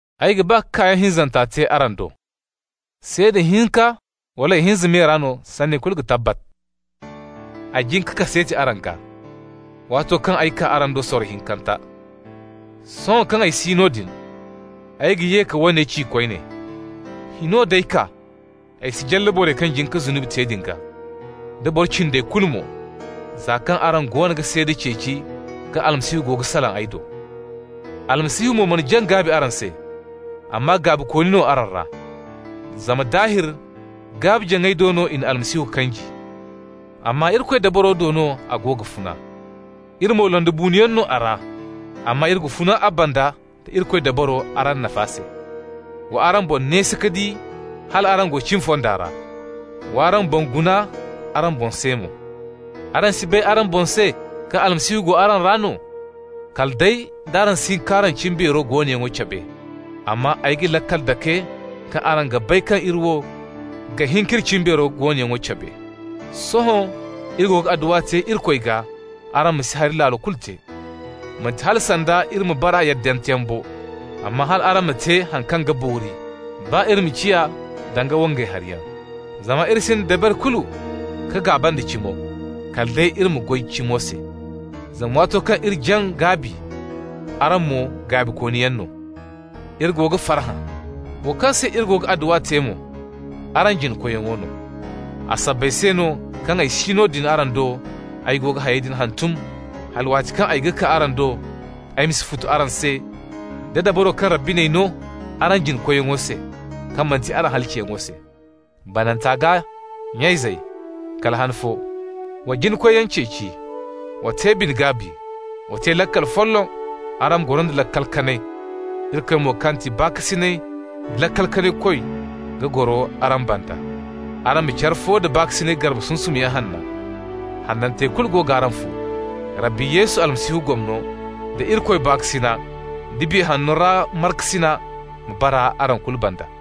Ay ga ba ka kaayaŋ hinzanta te araŋ do. «Seeda hinka wala ihinza me ra no sanni kulu ga tabbat.» Ay jin ka kaseeti araŋ gaa, waato kaŋ ay kaa araŋ do sorro hinkanta. Sohõ kaŋ ay si noodin, ay ga ye ka woone ci koyne: Hino d'ay kaa ay si jalla borey kaŋ jin ka zunubi te din gaa, da boro cindey kulu mo, za kaŋ araŋ goono ga seeda ceeci kaŋ Almasihu go ga salaŋ ay do. Almasihu mo mana jaŋ gaabi araŋ se, amma gaabikooni no araŋ ra. Zama daahir gaabi-jaŋay do no i na Almasihu kanji, amma Irikoy dabaro do no a go ga funa. Iri mo londibuunoyaŋ no a ra, amma iri ga funa a banda nda Irikoy dabaro araŋ nafa se. Wa araŋ boŋ neesi ka di hal araŋ go cimi fonda ra, wa araŋ boŋ guna araŋ boŋ se mo. Araŋ si bay araŋ boŋ se kaŋ Almasihu go araŋ ra no? Kala day d'araŋ si hin k'araŋ cimbeero goonoyaŋo cabe! Amma ay ga laakal dake kaŋ araŋ ga bay kaŋ iri wo ga hin k'iri cimbeero goonoyaŋo cabe. Sohõ iri go ga adduwa te Irikoy gaa araŋ ma si hari laalo kulu te. Manti hala sanda iri ma bara yaddanteyaŋ bo, amma hal araŋ ma te haŋ kaŋ ga boori, baa iri ma ciya danga wangay hariyaŋ. Zama iri sinda dabari kulu ka gaaba nda cimo, kala day iri ma goy cimo se. Zama waato kaŋ iri jaŋ gaabi, araŋ mo gaabikooniyaŋ no, iri go ga farhã. Wo kaŋ se iri go ga adduwa te mo: araŋ jina-koyyaŋo no. A sabbay se no kaŋ ay si noodin araŋ do, ay go ga hayey din hantum hala waati kaŋ ay kaa araŋ do, ay ma si futu araŋ se da dabaro kaŋ Rabbi n'ay no araŋ jina-koyyaŋo se, kaŋ manti araŋ halaciyaŋo se. Bananta gaa, nya-izey, kala han fo. Wa jina-koyyaŋ ceeci. Wa te bine-gaabi. Wa te laakal folloŋ. Araŋ ma goro nda laakal kanay. Irikoy mo, kaŋ ga ti baakasinay da laakal kanay Koy ga goro araŋ banda. Araŋ ma care fo da baakasinay garbe sunsumyaŋ hanna. Hanantey kulu go g'araŋ fo. Rabbi Yesu Almasihu gomno, da Irikoy baakasina, da Biya Hanno ra markasina ma bara araŋ kulu banda.